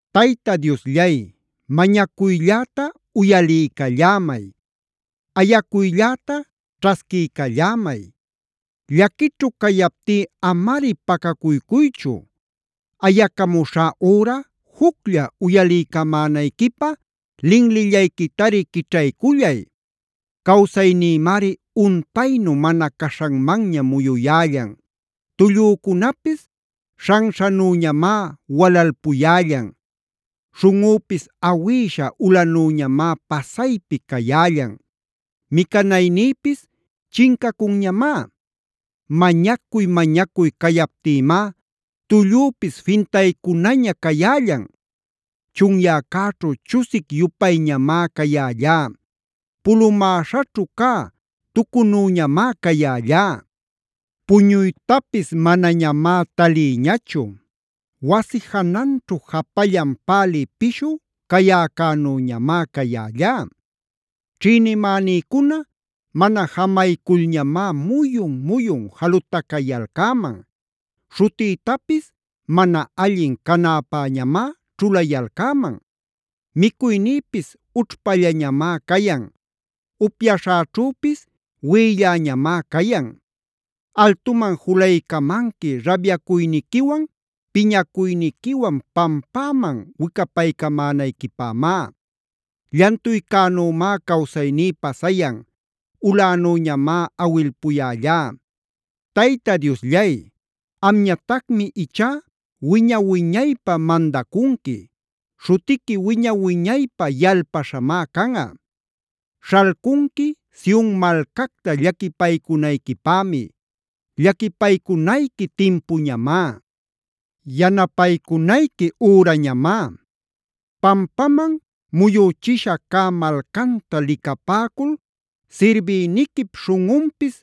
Tayta Diosllay, mañacuylläta uyaliycallämay. Ayacuylläta ćhasquiycallämay. Llaquićhu cayaptí amari pacacuycuychu. Ayacamuśhá üra juclla uyaliycamänayquipä linlillayquitari quićhaycullay. Cawsaynïmari untaynu mana caśhanmanña muyuyällan. Tullücunapis śhanśhanüñamá walalpuyällan. Śhunꞌüpis awïśha ulanüñamá pasaypi cayällan. Micanaynïpis chincacunñamá. Mañacuy-mañacuy cayaptïmá tullüpis fintaycunaña cayällan. Chunyäcäćhu chusic-yupayñamá cayällá. Pulumäśhaćhu cä tucunüñamá cayällá. Puñuytapis manañamá talïñachu. Wasi jananćhu japallan pälï pishu cäyäcänüñamá cayällá. Ćhïnimänïcuna mana jamayculñamá muyun-muyun jalutacayalcäman. Śhutïtapis mana allin canäpäñamá ćhulayalcäman. Micuynïpis ućhpallañamá cayan. Upyaśhäćhüpis wiꞌilläñamá cayan. Altuman julaycamanqui rabyacuyniquiwan piñacuyniquiwan pampäman wicapaycämänayquipämá. Llantuycänümá cawsayní pasayan.a Ulänüñamá awilpuyällá. Tayta Diosllay, amñatacmi ichá wiña-wiñaypä mandacunqui. Śhutiqui wiña-wiñaypä yalpaśhamá canꞌa. Śhalcunqui Sion malcacta llaquipaycunayquipämi. Llaquipaycunayqui timpuñamá. Yanapaycunayqui ürañamá. Pampaman muyüchisha cä malcanta licapäcul sirbïniquip śhunꞌunpis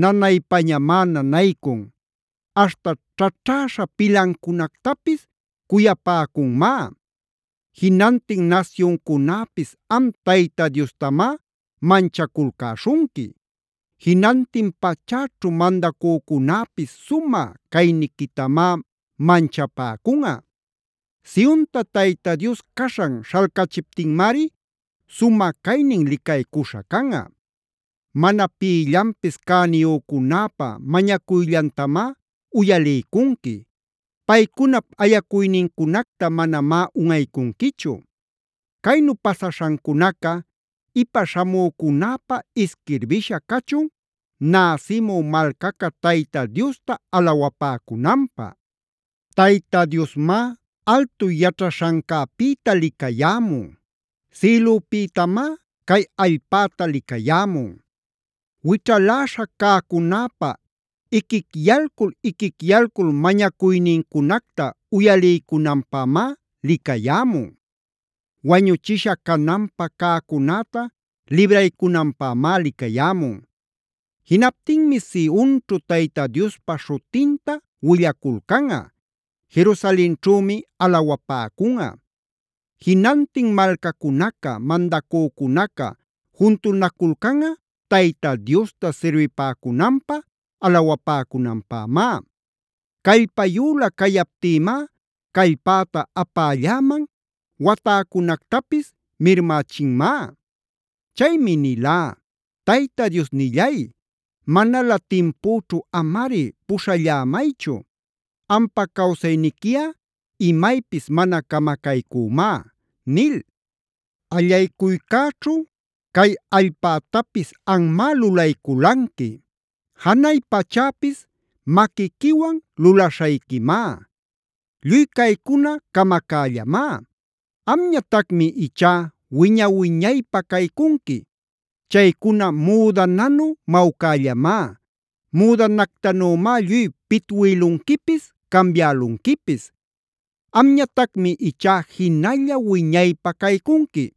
nanaypañamá nanaycun. Aśhta ćhaćhäśha pilancunactapis cuyapäcunmá. Jinantin nasyuncunäpis am Tayta Diostamá manchaculcäśhunqui. Jinantin pachäćhu mandacücunäpis sumä cayniquitamá manchapäcunꞌa. Sionta Tayta Dios caśhan śhalcachiptinmari sumä caynin licaycuśha canꞌa. Mana pïllanpis cäniyücunäpa mañacuyllantamá uyaliycunqui. Paycunap ayacuynincunacta manamá unꞌaycunquichu. Caynu pasaśhancunaca ipa śhamücunäpä isquirbisha cachun, näsimü malcaca Tayta Diosta alawapäcunanpä. Tayta Diosmá altu yaćhaśhancäpïta licayämun. Sïlüpïtamá cay allpäta licayämun. Wićhaläśha cäcunäpa iquicyalcul-iquicyalcul mañacuynincunacta uyaliycunanpämá licayämun. Wañuchisha cananpä cäcunäta libraycunanpämá licayämun. Jinaptinmi Sionćhu Tayta Diospa śhutinta willaculcanꞌa. Jerusalenćhümi alawapäcunꞌa. Jinantin malcacunaca, mandacücunaca juntunaculcanꞌa Tayta Diosta sirbipäcunanpä, alawapäcunanpämá. Callpayülä cayaptïmá callpäta apälläman, watäcunactapis mirmächinmá. Chaymi nilá: “Tayta Diosnillay, manalä timpüćhu amari puśhallämaychu. Ampa cawsayniquiꞌa imaypis mana camacaycümá” nil. Allaycuycäćhu cay allpätapis anmá lulayculanqui. Janay pachäpis maquiquiwan lulaśhayquimá. Lluy caycuna camacällamá. Amñatacmi ichá wiña-wiñaypä caycunqui. Chaycuna müdananu mawcällamá. Müdanactanümá lluy pitwïlunquipis, cambiälunquipis. Amñatacmi ichá jinalla wiñaypä caycunqui.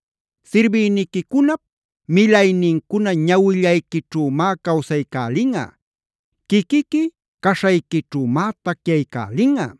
Sirbïniquicunap milaynincuna ñawillayquićhümá cawsaycälinꞌa. Quiquiqui caśhayquićhümá tacyaycälinꞌa.